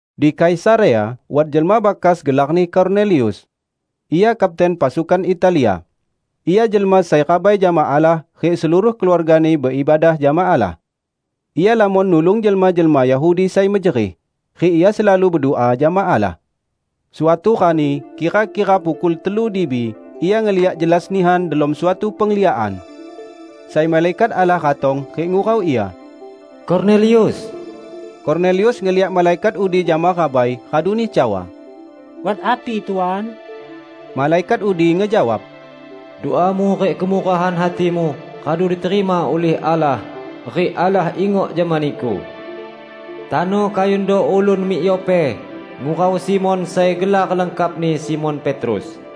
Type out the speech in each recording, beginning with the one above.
Di Kaisarea wat jelma bakas gelarni Kornelius. Ia kapten "Pasukan Italia". Ia jelma sai rabai jama Allah rik seluruh keluargani beibadah jama Allah. Ia lamon nulung jelma-jelma Yahudi sai mejerih, rik ia selalu bedua jama Allah. Suatu rani kira-kira pukul telu dibi ia ngeliak jelas nihan delom suatu pengliakan, sai malaikat Allah ratong rik ngurau ia, "Kornelius!" Kornelius ngeliak malaikat udi jama rabai raduni cawa, "Wat api Tuan?" Malaikat udi ngejawab, "Duamu rik kemurahan hatimu radu diterima ulih Allah rik Allah ingok jama niku. Tano kayundo ulun mik Yope ngurau Simon sai gelar lengkapni Simon Petrus.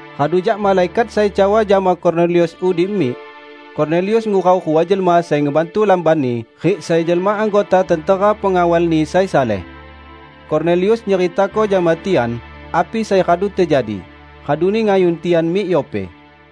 Radu jak malaikat sai cawa jama Kornelius udi mik, Kornelius ngurau rua jelma sai ngebantu lambanni rik sai jelma anggota tentera pengawalni sai saleh. Kornelius nyeritako jama tian api sai radu tejadi, raduni ngayun tian mik Yope.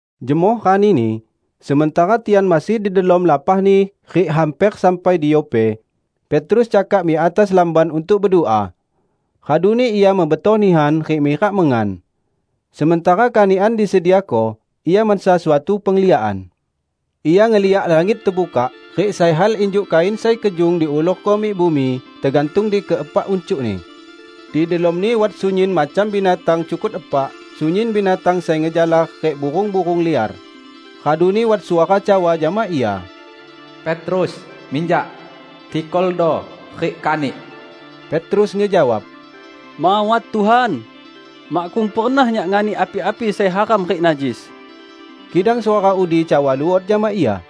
Jemoh ranini, sementara tian masih di delom lapahni rik hamper sampai di Yope, Petrus cakak mik atas lamban untuk bedua. Raduni ia mebetoh nihan rik mirak mengan. Sementara kanikan disediako, ia mansa suatu pengliakan. Ia ngeliak langit tebukak rik sai hal injuk kain sai kejung diulurko mik bumi, tegantung di keepak uncukni. Di delomni wat sunyin macam binatang cukut epak, sunyin binatang sai ngejalar rik burung-burung liar. Raduni wat suara cawa jama ia, "Petrus, minjak! Tikoldo rik kanik!" Petrus ngejawab, "Mawat, Tuhan! Makkung pernah nyak nganik api-api sai haram rik najis." Kidang suara udi cawa luot jama ia,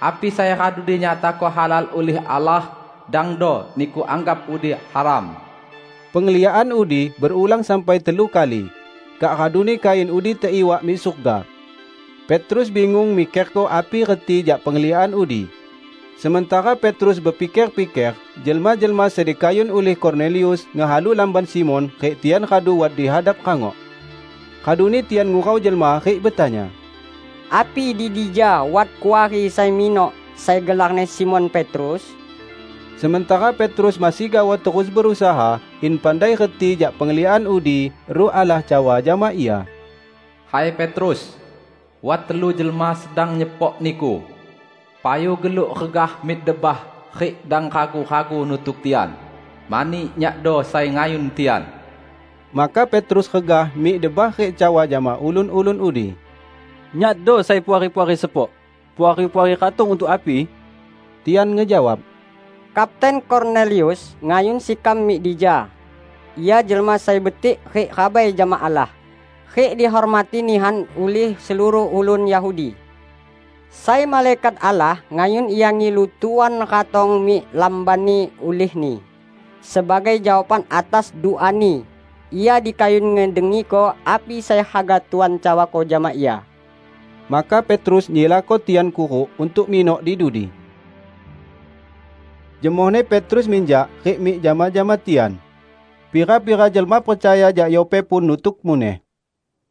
"Api sai radu dinyatako halal ulih Allah, dangdo niku anggap udi haram." Pengliakan udi berulang sampai telu kali, kak raduni kain udi teiwak mik surga. Petrus bingung mikerko api reti jak pengliakan udi. Sementara Petrus bepiker-piker, jelma-jelma sai dikayun ulih Kornelius ngehalu lamban Simon rik tian radu wat di hadap rangok. Raduni tian ngurau jelma rik betanya, "Api di dija wat kuari sai minok, sai gelarni Simon Petrus?" Sementara Petrus masih gaoh terus berusaha in pandai reti jak pengliakan udi, Ruh Allah cawa jama ia, "Hai Petrus, wat telu jelma sedang nyepok niku. Payu geluk regah mik debah rik dang ragu-ragu nutuk tian, mani Nyakdo sai ngayun tian." Maka Petrus regah mik debah rik cawa jama ulun-ulun udi, "Nyakdo sai puari-puari sepok. Puari-puari ratong untuk api?" Tian ngejawab, "Kapten Kornelius ngayun sekam mik dija. Ia jelma sai betik rik rabai jama Allah, rik dihormati nihan ulih seluruh ulun Yahudi. Sai malaikat Allah ngayun ia ngilu Tuan ratong mik lambanni ulihni, sebagai jawaban atas duani, ia dikayun ngedengiko api sai haga Tuan cawako jama ia." Maka Petrus nyilako tian kuruk untuk minok di dudi. Jemohni Petrus minjak rik mik jama-jama tian. Pira-pira jelma percaya jak Yope pun nutuk muneh.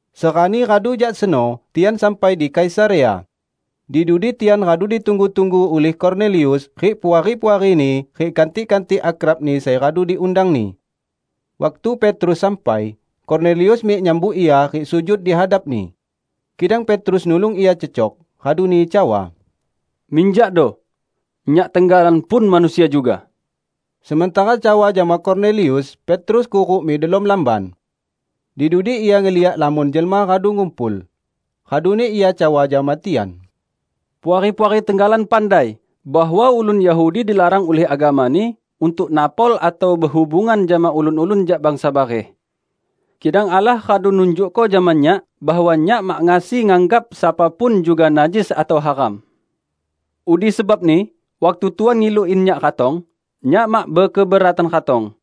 Serani radu jak seno tian sampai di Kaisarea. Di dudi tian radu ditunggu-tunggu ulih Kornelius rik puari-puarini rik kantik-kantik akrabni sai radu diundangni. Waktu Petrus sampai, Kornelius mik nyambut ia rik sujud di hadapni. Kidang Petrus nulung ia cecok, raduni cawa, "Minjakdo! Nyak tenggalan pun manusia juga." Sementara cawa jama Kornelius, Petrus kuruk mik delom lamban. Di dudi ia ngeliak lamon jelma radu ngumpul. Raduni ia cawa jama tian, "Puari-puari tenggalan pandai bahwa ulun Yahudi dilarang ulih agamani untuk napol atau behubungan jama ulun-ulun jak bangsa bareh. Kidang Allah radu nunjukko jama nyak bahwa nyak mak ngasi nganggap sapa pun juga najis atau haram. Udi sebabni waktu Tuan ngilu in nyak ratong, nyak mak bekeberatan ratong.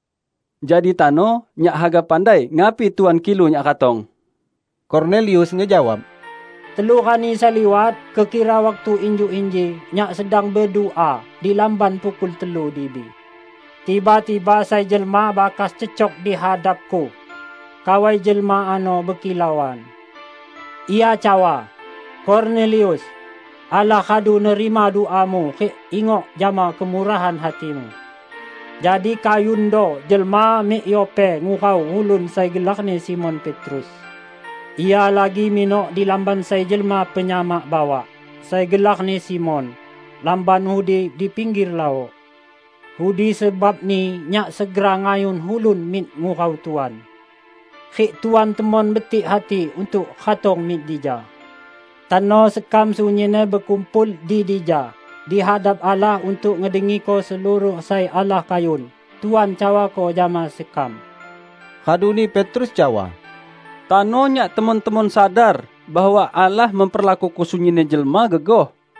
Jadi tano nyak haga pandai ngapi Tuan kilu nyak ratong." Kornelius ngejawab, "Telu rani sai liwat, kekira waktu injuk inji, nyak sedang bedua di lamban pukul telu dibi. Tiba-tiba sai jelma bakas cecok di hadapku. Kawai jelma ano bekilauan. Ia cawa, 'Kornelius! Allah radu nerima duamu rik ingok jama kemurahan hatimu. Jadi kayundo jelma mik Yope ngurau ulun sai gelarni Simon Petrus. Ia lagi minok di lamban sai jelma penyamak bawak sai gelarni Simon; lamban udi di pingger laok.' Udi sebabni nyak segera ngayun ulun mik ngurau Tuan. Rik Tuan temon betik hati untuk ratong mik dija. Tano sekam sunyinni bekumpul di dija di hadap Allah untuk ngedengiko seluruh sai Allah kayun Tuan cawako jama sekam." Raduni Petrus cawa, "Tano nyak temon-temon sadar bahwa Allah memperlakuko sunyinni jelma gegoh.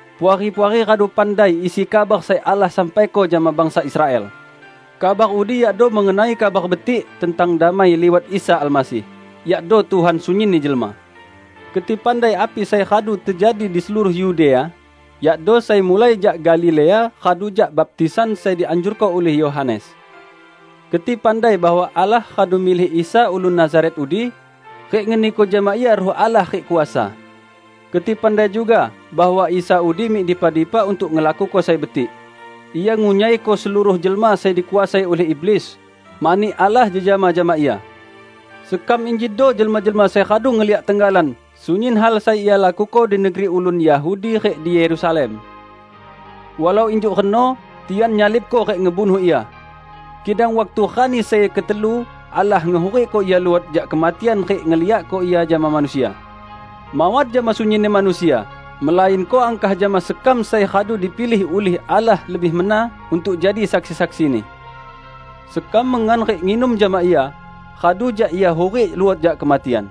Puari-puari radu pandai isi kabar sai Allah sampaiko jama bangsa Israel. Kabar udi yakdo mengenai Kabar Betik tentang damai liwat Isa Almasih, yakdo Tuhan sunyinni jelma. Keti pandai api sai radu tejadi di seluruh Yudea, yakdo sai mulai jak Galilea radu jak baptisan sai dianjurko ulih Yohanes. Keti pandai bahwa Allah radu milih Isa ulun Nazaret udi rik ngeniko jama Ia Ruh Allah rik kuasa. Keti pandai juga bahwa Isa udi mik dipa-dipa untuk ngelakuko sai betik; Ia ngunyaiko seluruh jelma sai dikuasai ulih iblis, mani Allah jejama jama Ia. Sekam injido jelma-jelma sai radu ngeliak tenggalan sunyin hal sai Ia lakuko di negeri ulun Yahudi rik di Yerusalem. Walau injuk reno tian nyalibko rik ngebunuh Ia. Kidang waktu rani sai ketelu Allah ngehurikko Ia luot jak kematian rik ngeliakko Ia jama manusia; mawat jama sunyinni manusia, melainko angkah jama sekam sai radu dipilih ulih Allah lebih mena untuk jadi saksi-saksi-Ni: Sekam mengan rik nginum jama Ia radu jak Ia hurik luot jak kematian.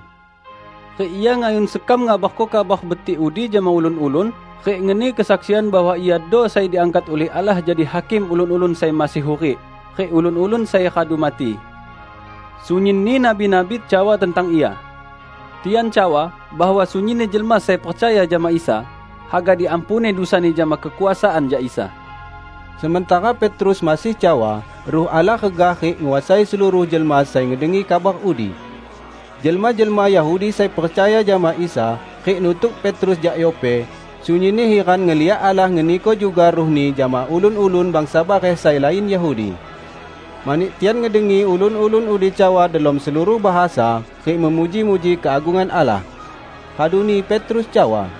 Rik Ia ngayun sekam ngabarko Kabar Betik udi jama ulun-ulun rik ngeni kesaksian bahwa Iado sai diangkat ulih Allah jadi Hakim ulun-ulun sai masih hurik rik ulun-ulun sai radu mati. Sunyinni nabi-nabi cawa tentang Ia. Tian cawa bahwa sunyinni jelma sai percaya jama Isa, haga diampuni dusani jama kekuasaan jak Isa." Sementara Petrus masih cawa, Ruh Allah regah rik nguasai seluruh jelma sai ngedengi kabar udi. Jelma-jelma Yahudi sai percaya jama Isa rik nutuk Petrus jak Yope, sunyinni hiran ngeliak Allah ngeniko juga Ruh-Ni jama ulun-ulun bangsa bareh sai lain Yahudi. Mani tian ngedengi ulun-ulun udi cawa delom seluruh bahasa rik memuji-muji keagungan Allah. Raduni Petrus cawa,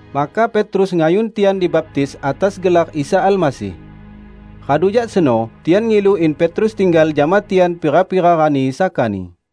Maka Petrus ngayun tian dibaptis atas gelar Isa Almasih. Radu jak seno tian ngilu in Petrus tinggal jama tian pira-pira rani sakani.